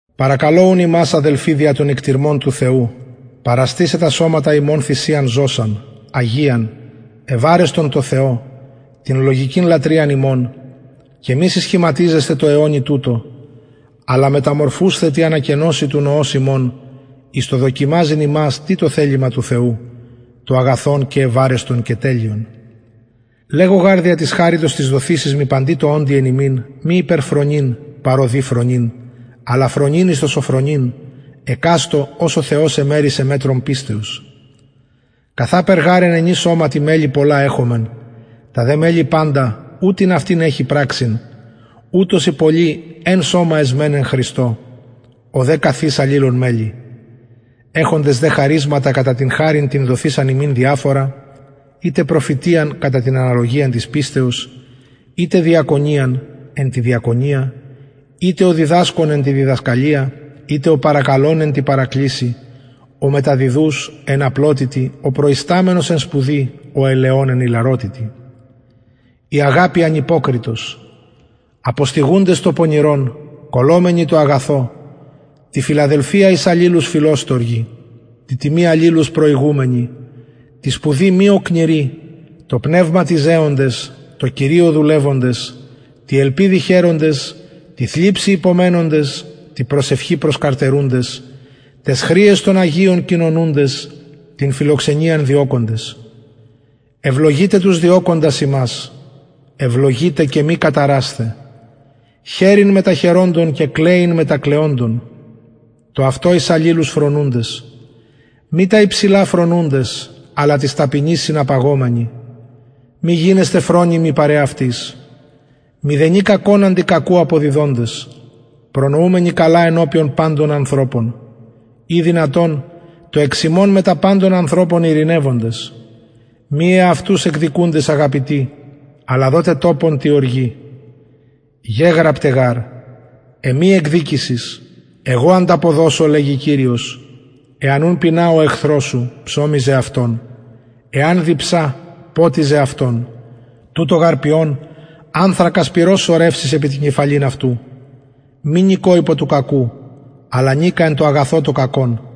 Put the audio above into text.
παρακαλω ουν υμας αδελφοι δια των οικτιρμων του θεου παραστησαι τα σωματα υμων θυσιαν ζωσαν αγιαν ευαρεστον τω θεω την λογικην λατρειαν υμων και μη συσχηματιζεσθαι τω αιωνι τουτω αλλα μεταμορφουσθαι τη ανακαινωσει του νοος υμων εις το δοκιμαζειν υμας τι το θελημα του θεου το αγαθον και ευαρεστον και τελειον λεγω γαρ δια της χαριτος της δοθεισης μοι παντι τω οντι εν υμιν μη υπερφρονειν παρ ο δει φρονειν αλλα φρονειν εις το σωφρονειν εκαστω ως ο θεος εμερισεν μετρον πιστεως καθαπερ γαρ εν ενι σωματι μελη πολλα εχομεν τα δε μελη παντα ου την αυτην εχει πραξιν ουτως οι πολλοι εν σωμα εσμεν εν χριστω ο δε καθ εις αλληλων μελη εχοντες δε χαρισματα κατα την χαριν την δοθεισαν ημιν διαφορα ειτε προφητειαν κατα την αναλογιαν της πιστεως ειτε διακονιαν εν τη διακονια ειτε ο διδασκων εν τη διδασκαλια ειτε ο παρακαλων εν τη παρακλησει ο μεταδιδους εν απλοτητι ο προισταμενος εν σπουδη ο ελεων εν ιλαροτητι η αγαπη ανυποκριτος αποστυγουντες το πονηρον κολλωμενοι τω αγαθω τη φιλαδελφια εις αλληλους φιλοστοργοι τη τιμη αλληλους προηγουμενοι τη σπουδη μη οκνηροι τω πνευματι ζεοντες τω κυριω δουλευοντες τη ελπιδι χαιροντες τη θλιψει υπομενοντες τη προσευχη προσκαρτερουντες ταις χρειαις των αγιων κοινωνουντες την φιλοξενιαν διωκοντες ευλογειτε τους διωκοντας υμας ευλογειτε και μη καταρασθε χαιρειν μετα χαιροντων και κλαιειν μετα κλαιοντων το αυτο εις αλληλους φρονουντες μη τα υψηλα φρονουντες αλλα τοις ταπεινοις συναπαγομενοι μη γινεσθε φρονιμοι παρ εαυτοις μηδενι κακον αντι κακου αποδιδοντες προνοουμενοι καλα ενωπιον παντων ανθρωπων ει δυνατον το εξ υμων μετα παντων ανθρωπων ειρηνευοντες μη εαυτους εκδικουντες αγαπητοι αλλα δοτε τοπον τη οργη γεγραπται γαρ εμοι εκδικησις εγω ανταποδωσω λεγει κυριος εαν ουν πεινα ο εχθρος σου ψωμιζε αυτον εαν διψα ποτιζε αυτον τουτο γαρ ποιων ανθρακας πυρος σωρευσεις επι την κεφαλην αυτου μη νικω υπο του κακου αλλα νικα εν τω αγαθω το κακον